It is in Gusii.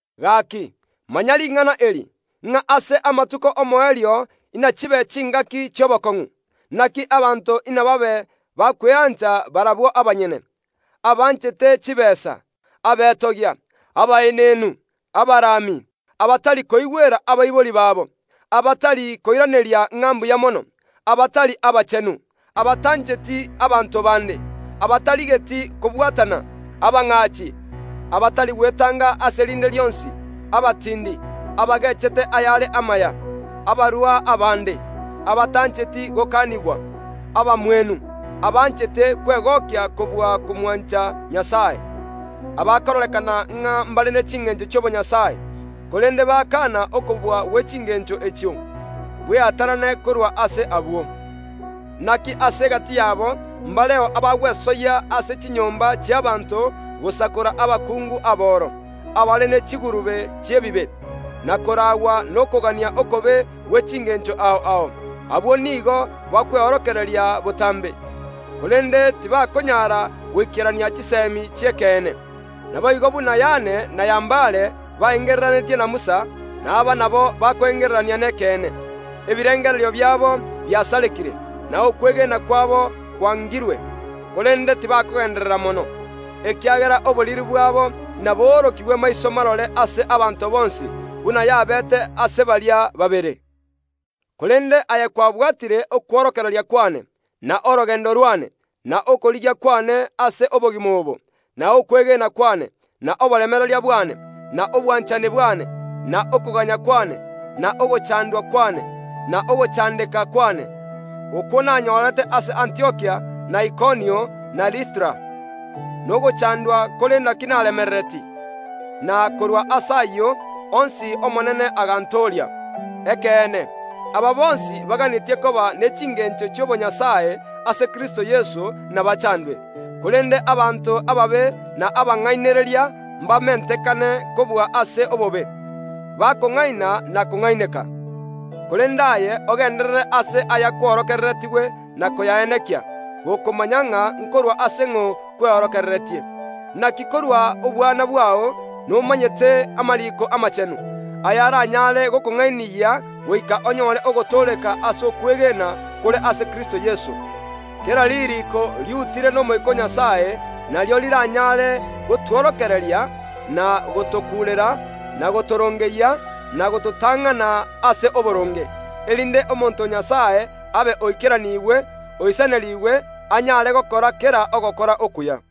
Gaaki, manya ring’ana eri, ng’a ase amatuko y’omoerio inachibe chingaki chi’obokong’u. Inaki abanto inababe bakweancha barabwo abanyene, abanchete chitaabu, abetogia, abaenenu, abarami, abatari koigwera abaibori babo, abatari koiraneria ng’a mbuya mono, abatari abachenu, abatancheti abanto baande, abatarigeti kobwatana, abang’aachi, abatari gwetanga ase rinde rionsi, abatiindi, abageechete ayare amaya, abarua abaande, abatancheti gokanigwa, abamwenu, abanchete kwegokia kobua komwancha Nyasae, abakororekana ng’a mbare ne chingeencho chi’obonyasae, korende bakaana okobua gwe chingeencho echio. Bweatanane korwa ase abwo. Inaki ase egati yabo mbareo abagwesoyia ase chinyomba chi’abaanto gosakora abakungu aboro, abare ne chigurube chi’ebibe, na koraagwa nokogania okobe gwe chingeencho ao ao. Abakungu abwo nigo bakweorokereria botaambe, korende tibakonyara goikera chiseemi chi’ekeene. Naboigo buna Yane na Yambare baengereranetie na Musa, na aba nabo bakoengererania nekeene. Ebirengererio biabo biasarekire, na okwegena kwabo kwangirwe, korende tibakogeenderera mono, ekiagera oboriri bwabo naboorokigwe maiso marore ase abanto bonsi, buna yabeete ase baria babere. Korende aye kwabwatire okworokereria kw’ane, na orogeendo rw’ane, na okorigia kw’ane ase obogima obo, na okwegena kw’ane, na oboremereria bwane, na obwanchani bwane, na okoganya kw’ane, na ogochaandwa kw’ane, na ogochaandeka kw’ane, okwo nanyorete ase Antiokia na Ikonio, na Listra. Nogochaandwa kore inaki naremereretie! Na korwa ase ayio onsi Omonene agantooria. Ekeene, aba bonsi baganetie koba ne chingeencho chi’obonyasae ase Kristo Yeso inabachaandwe. Korende abanto ababe na abang’ainereria mbamentekane kobua ase obobe, bakong’aina na kong’aineka. Korende aye, ogenderere ase ayakworokereretigwe na koyaenekia, gokomanya ng’a nkorwa ase ng’o kweorokereretie. Inaki korwa obwana bwao nomanyete amariiko amaachenu, ayaraanyare gokong’ainiyia goika onyore ogotooreka ase okwegena kore ase Kristo Yeso. Kera ririiko riutire n’Omoika o Nyasae, nario riranyare gotworokereria, na gotokuurera, na gotorongeyia, na gototang’ana ase oboronge, erinde omonto o Nyasae abe oikeranigwe, oisanerigwe, anyare gokora kera ogokora okuya.